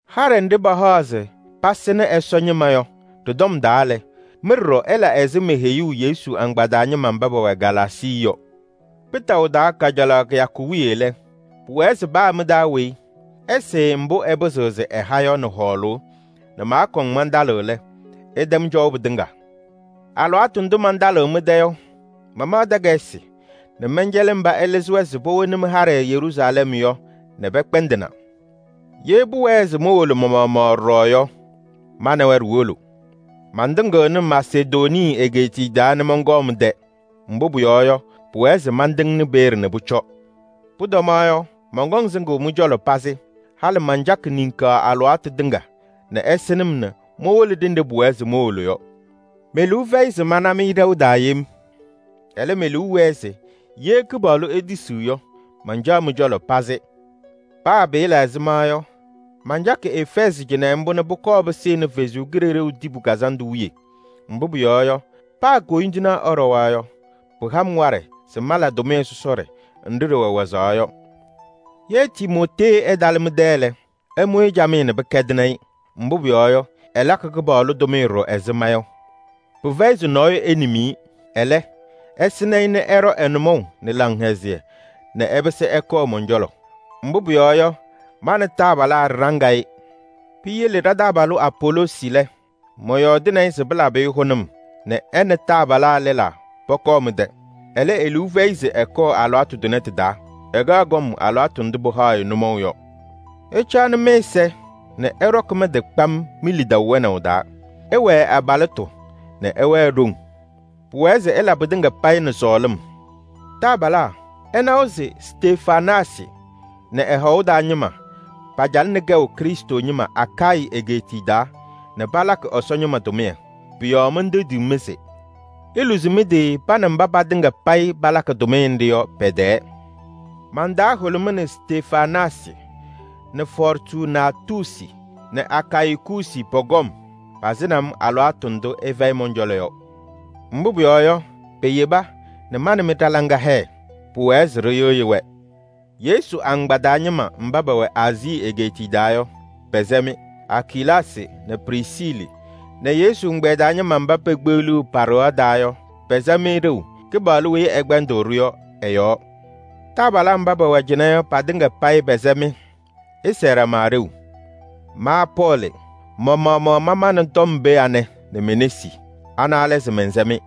Haɖɛ nɖɩ pahaɣ se pasɩnɩ Ɛsɔ ñɩma yɔ ɖɩ-tɔm taa lɛ, mɩ ɖɔɖɔ ɩla ɛzɩ meheyuu Yesu agbaa taa ñɩma mba pɛwɛ Galaasii yɔ. Kpɩtaʋ taa kajalaɣ kɩyakʋ wiye lɛ, pʋwɛɛ se paa mɩ-taa weyi ɛsɩɩ mbʋ ɛpɩzɩɣ se ɛha yɔ nɛ hɔɔlʋʋ nɛ maakɔŋ mantalɩɣ lɛ, ɩtɛm cɔʋ pɩtɩŋa. Alɩwaatʋ ndʋ mantalɩɣ mɩ-tɛ yɔ, mamaɣ takayɩsɩ nɛ mɛncɛlɩ mba ɩlɩzɩ-wɛ se powoni mɩ-haɖɛ Yeruusalɛm yɔ nɛ pɛkpɛndɩna. Ye pʋwɛɛ se mowolo ma-maɣmaɣ ɖɔɖɔ yɔ, ma nɛ wɛ ɖiwolo. Mantɩŋɩɣnɩ Masedonii egeetiye taa nɛ mɔnkɔɔ mɩ-tɛ. Mbʋ pʋyɔɔ yɔ, pʋwɛɛ se mantɩŋnɩ peeye nɛ pʋcɔ. Pʋtɔmaɣ yɔ, mɔnkɔŋ sɩŋʋʋ mɩ-cɔlɔ pazɩ. Halɩ mancakɩ niŋkaɣ alɩwaatʋ tɩŋa nɛ ɩsɩnɩ-m nɛ mowolo ɖenɖe pʋwɛɛ se mowolo yɔ. Me-liu fɛyɩ se mana-mɩ ɖɛʋ taa yem. Ɛlɛ, me-liu wɛɛ se ye Kɩpaɣlʋ etisiɣ yɔ, mancaɣ mɩ-cɔlɔ pazɩ. Paa pɩɩla ɛzɩma yɔ, mancakɩ Efɛɛzɩ cɩnɛ mbʋ nɛ pʋkɔɔ pɩsɩnɩ Kʋmtʋ Kazandʋ wiye. Mbʋ pʋyɔɔ yɔ, paa koyindinaa ɛɖɔwa yɔ, pɩha-m waɖɛ se mala tʋmɩyɛ sɔsɔɖɛ nɖɩ ɖɩwɛ wazaɣ yɔ. Ye Timootee ɛtalɩ mɩ-tɛ lɛ, ɩmʋ-ɩ camɩyɛ nɛ pɩkɛdɩnɩ-ɩ. Mbʋ pʋyɔɔ yɔ, ɛlakɩ Kɩpaɣlʋ tʋmɩyɛ ɖɔɖɔ ɛzɩ ma yɔ. Pɩfɛyɩ se nɔɔyʋ enim-i. Ɛlɛ, ɩsɩnɩ-ɩ nɛ ɛɖɔ ɛ-nʋmɔʋ nɛ laŋhɛzɩyɛ nɛ ɛpɩsɩ ɛkɔɔ mɔn-cɔlɔ. Mbʋ pʋyɔɔ yɔ, ma nɛ taabalaa ɖɩɖaŋ-ɩ. Piyele ɖa-taabalʋ Apoloosi lɛ, mɔyɔɔdɩnɩ-ɩ se pɩlabɩ-ɩ hʋnʋm nɛ ɛ nɛ taabalaa lɛlaa pɔkɔɔ mɩ-tɛ. Ɛlɛ, e-liu fɛyɩ se ɛkɔɔ alɩwaatʋ tʋnɛ tɩ-taa. Ɛkaɣ kɔm alɩwaatʋ ndʋ pɩhaɣ-ɩ nʋmɔʋ yɔ. Ɩcaɣnɩ mɩ-ɛza nɛ ɩɖɔkɩ mɩ-tɩ kpam mi-lidaʋ wɛnaʋ taa. Ɩwɛɛ abalɩtʋ nɛ ɩwɛɛ ɖoŋ. Pʋwɛɛ se ɩla pɩtɩŋa payɩ nɛ sɔɔlɩm. Taabalaa, ɩnawa se Stefanaasɩ nɛ ɛ-hɔʋ taa ñɩma pacalɩnɩ kɛʋ Krɩstʋ ñɩma Akayɩ egeetiye taa nɛ palakɩ Ɛsɔ ñɩma tʋmɩyɛ. Pʋ-yɔɔ mentendiɣ-mɩ se: iluzi mɩ-tɩ pa nɛ mba patɩŋa payɩ palakɩ tʋmɩyɛ nɖɩ yɔ pɛ-tɛɛ. Man-taa hʋlʋmɩnɩ Stefanaasɩ nɛ Fɔɔrtunaatusi nɛ Akayikuusi pɔ-kɔm. Pasɩnɩ-m alɩwaatʋ ndʋ ɩfɛyɩ mɔn-cɔlɔ yɔ. Mbʋ pʋyɔɔ yɔ, peyeba nɛ ma nɛ mɩ ɖa-laŋa hɛɛ. Pʋwɛɛ se ɖɩyɩɣyɩ-wɛ. Yesu agbaa taa ñɩma mba pɛwɛ Aazii egeetiye taa yɔ, pɛsɛ-mɩ. Akilaasɩ nɛ Prisiili nɛ Yesu ɛgbɛyɛ taa ñɩma mba pekpeɣliɣ pa-ɖɩɣa taa yɔ, pɛsɛ-mɩ ɖeu Kɩpaɣlʋ weyi ɛkpɛndɩɣ-ɖʋ yɔ ɛ-yɔɔ. Taabalaa mba pɛwɛ cɩnɛ yɔ, patɩŋa payɩ pɛsɛ-mɩ. Ɩsɛɛ ɖama ɖeu. Ma Pɔɔlɩ, ma-maɣmaɣ mamaɣnɩ tɔm pee anɛ nɛ me-nesi. Ana lɛ se: mɛnsɛ-mɩ.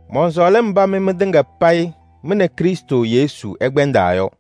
Mɔnsɔɔlɩ mba mɩ mɩtɩŋa payɩ mɩ nɛ Krɩstʋ Yesu ɩkpɛndaa yɔ.